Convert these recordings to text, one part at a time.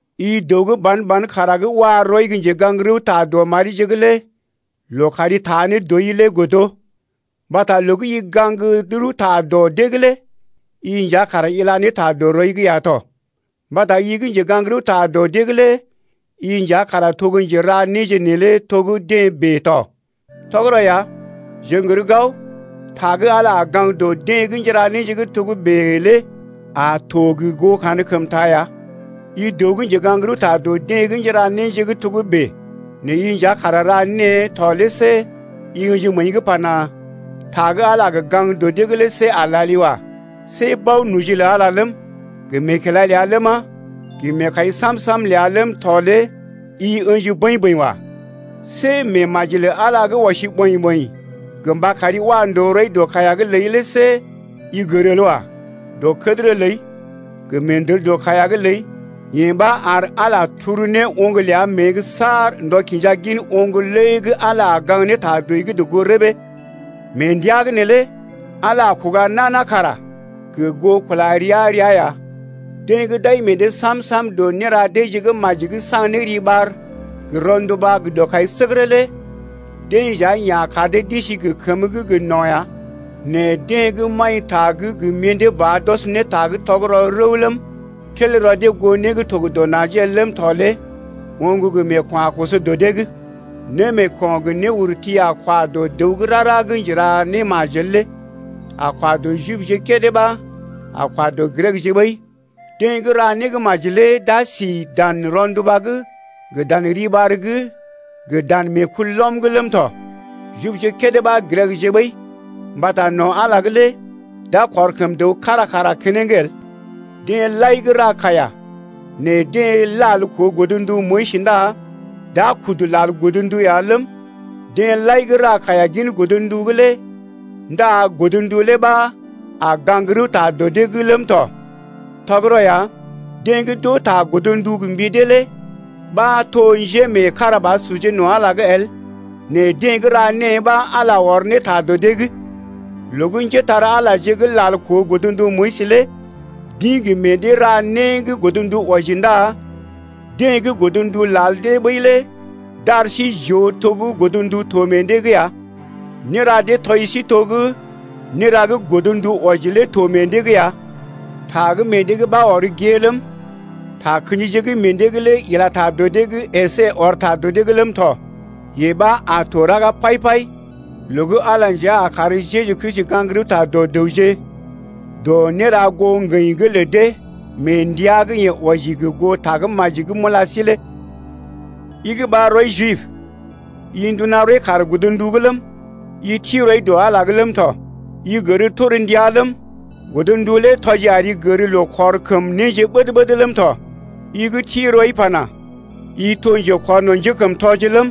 I dəw gə́ ban-ban kara gə́ wa rɔi gə́ njegaŋ-rəwta dɔ marije’g lé loo kari taa ne dɔi godo. Mbata loo gə́ i gaŋg rəwta dɔ dee’g lé i nja kara ila ne ta dɔ rɔi’g ya to mbata i gə́ njegaŋ-rəwta dɔ dee’g lé i nja kara to gə́ njera néje neelé to gə́ deḛ bèe tɔ. Tɔgərɔ ya jeḛ n’gər gao ta gə́ Ala a gaŋg dɔ deḛ gə́ njéra néje gə́ togə́bè lé a to gə goo kankəmta ya. I dəw gə́ njegaŋ-rəwta dɔ deḛ gə́ njéra néje gə́ togə́bè nɛ i nja kara ra née to lé see i ə̰ji məəi’g pana: Ta gə́ Ala a gə gaŋg dɔ dee’g lé see a lali wa. See bao-noji lə Ala ləm, gə meekila ləa ləma, gə meekai sam-sam ləa ləm tɔ lé i ə̰ji bəḭ-bəḭ wa. See meemaji lə Ala gə́ ɔsi ɓɔḭ-ɓɔḭ gə mba kari wa ndòo rɔi dɔ kaiya’g ləi lé see i gər el wa. Dɔkədərə ləi gə meendər dɔ kaiya’g ləi yee ɓa ar Ala turu ne oŋg ləa mée’g saar ndɔ kinja gin oŋg lé gə́ Ala a gaŋg ne ta dɔi’g gə goo rəbee. Mee ndəa’g neelé Ala a kuga nana kara gə goo kula rəa-rəa ya. Deḛ gə́ d’ai meḛ dee sam-sam dɔ néra deeje gə́ maji’g saŋg ne riɓar gə rɔnduba gə dɔkaisəgərə lé dee nja yeḛ a kar dee d’isi gə kəmə gə́ gə no̰ ya. Nɛ deḛ gə́ maḭta gə́ gə mḭdé ba d’ɔs ne ta gə́ tɔgərɔ rəw ləm, tel rɔ dee goo né gə́ dɔ najee el ləm tɔ lé oŋg gə meeko̰ a koso dɔ dee’g. Némeeko̰ gə néurti a kwa dɔ dəw gə́ rara ɓa gə́ njera némajel lé, a kwa dɔ Jibje kédé ɓa a kwa dɔ Grekje ɓəi. Deḛ gə́ ra némaji lé d’a si dan rɔnduba’g gə dan riɓar’g gə dan meekulɔm’g ləm tɔ, Jibje kédé ɓa Grekje ɓəi! Mbata no̰ Ala’g lé d’a kɔr kəm dəw kára kara keneŋ el. Deḛ lai gə́ ra kaiya nɛ deḛ lal koo godndu Moyis ndá d’a kudu lal godndu ya ləm, deḛ lai gə́ ra kaiya gin godndu’g lé ndá godndu lé ɓa a gaŋg rəwta dɔ dee’g ləm tɔ. Tɔgərɔ ya, deḛ gə́ d’oo ta godndu gə mbi dee lé ɓa to njémeekarabasurje no̰ Ala’g el, nɛ deḛ gə́ ra née ɓa Ala ɔr ne ta dɔ dee’g. Loo gə́ njépole-magəje gə́ lal koo godndu Moyis lé d’ḭ gə meḛ dee ra né gə́ godndu wɔji ndá deḛ gə́ godndu lal dee ɓəi lé d’ar sí j’oo to gə́ godndu to meḛ dee’g ya. Néra dee tɔji sí to gə́ néra gə́ godndu wɔji lé to meḛ dee’g ya. Ta gə́ meḛ dee’g ɓa ɔr gée ləm, takə̰jije gə́ meḛ dee’g lé ila ta dɔ dee’g əsé ɔr ta dɔ dee’g ləm tɔ. Yee ɓa a to raga pai-pai loo gə́ Ala nja a kar Jeju Kristi gaŋg rəwta dɔ dəwje dɔ néra goo ŋgəḭ’g lə dee mee ndəa gə́ yeḛ wɔji gə goo Tagə́maji gə́ m’ula sí lé. I gə́ ɓar rɔi Jib, i nduna rɔi kaar Godndu’g ləm, i ti rɔi dɔ Ala’g ləm tɔ, i gər torndia ləm, godndu lé tɔji ari gər loo kɔr kəm néje ɓəd-ɓəd ləm tɔ. I gə́ ti rɔi pana: I to gə́ njekɔrno̰ njékəmtɔje ləm,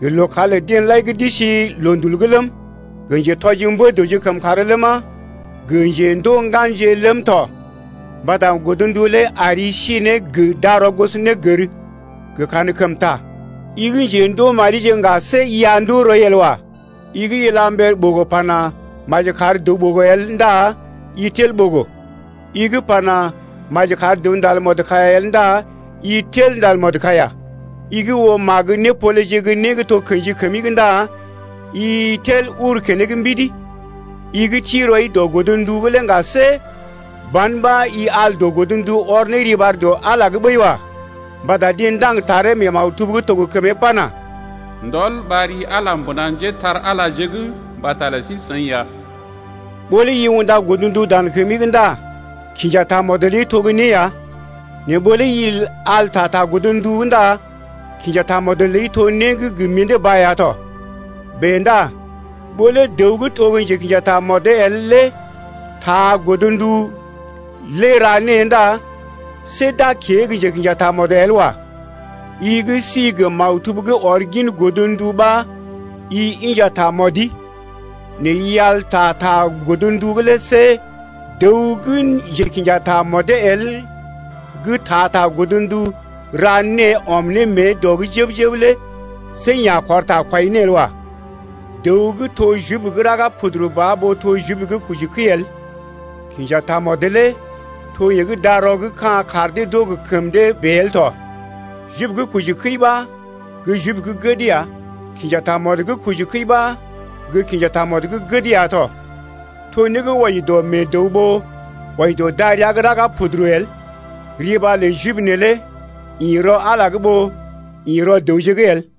gə lookàr lə deḛ lai gə́ d’isi loondul’g ləm, gə njetɔji mbə-dəwje kəmkàr ləma, gə njendoo ŋganje ləm tɔ. Mbata godndu lé ari sí ne gə darɔ gosonégər gə kankəmta. I gə́ njendoo marije ŋga, see i a ndoo rɔi el wa. I gə́ ila mber ɓogo pana: Maji kar dəw ɓogo el ndá i tel ɓogo. I gə́ pana: Maji kar dəw ndal mɔdkaiya el ndá i tel ndal mɔdkaiya. I gə́ oo magə népoleje gə́ né gə́ to kḛji kəmi’g ndá i tel uru keneŋ mbidi. I gə́ ti rɔi dɔ godndu’g lé ŋga, see ban ɓa i al dɔ godndu ɔr ne riɓar dɔ Ala’g ɓəi wa. Mbata deḛ ndaŋg taree mee maktub gə́ to gə kəmee pana: Ndɔl ɓar ri Ala mbuna njépole-magəje’g mbata lə sí-seḭ ya. Ɓó lé i unda godndu dan kəmi’g ndá kinja tamɔd ləi to gə́ né ya, nɛ ɓó lé i al ta ta godndu’g ndá kinja tamɔd ləi lé to né gə́ gə mḭdé ba ya tɔ. Bèe ndá ɓó lé dəw gə́ to gə́ njekḭja tamɔd el lé taa godndu lé ra née ndá see d’a kée gə́ njekḭja tamɔd el wa. I gə́ sí gə maktub gə́ ɔr gin godndu ɓa i inja tamɔdi nɛ i al ta ta godndu’g lé see dəw gə́ njekḭja tamɔdee el gə́ taa ta godndu ra née ɔm ne mée dɔ’g jəb-jəb lé see yeḛ a kɔr ta kwai ne el wa. Dəw gə́ to Jib gə́ raga puduru ba ɓó to Jib gə́ kojikəi el. Kinja tamɔd lé to yee gə́ darɔ’g ka̰ kar dee d’oo gə kəm dee bèe el tɔ. Jib gə́ kojikəi ɓa gə́ Jib gə́ gəd ya. Kinja tamɔd gə́ kojikəi ɓa gə́ kinja tamɔd gə́ gəd ya tɔ. To né gə́ wɔji dɔ meḛ dəw ɓó wɔji dɔ darəa gə́ raga puduru el. Riɓar lə Jib neelé ḭ rɔ Ala’g ɓó ḭ rɔ dəwje’g el.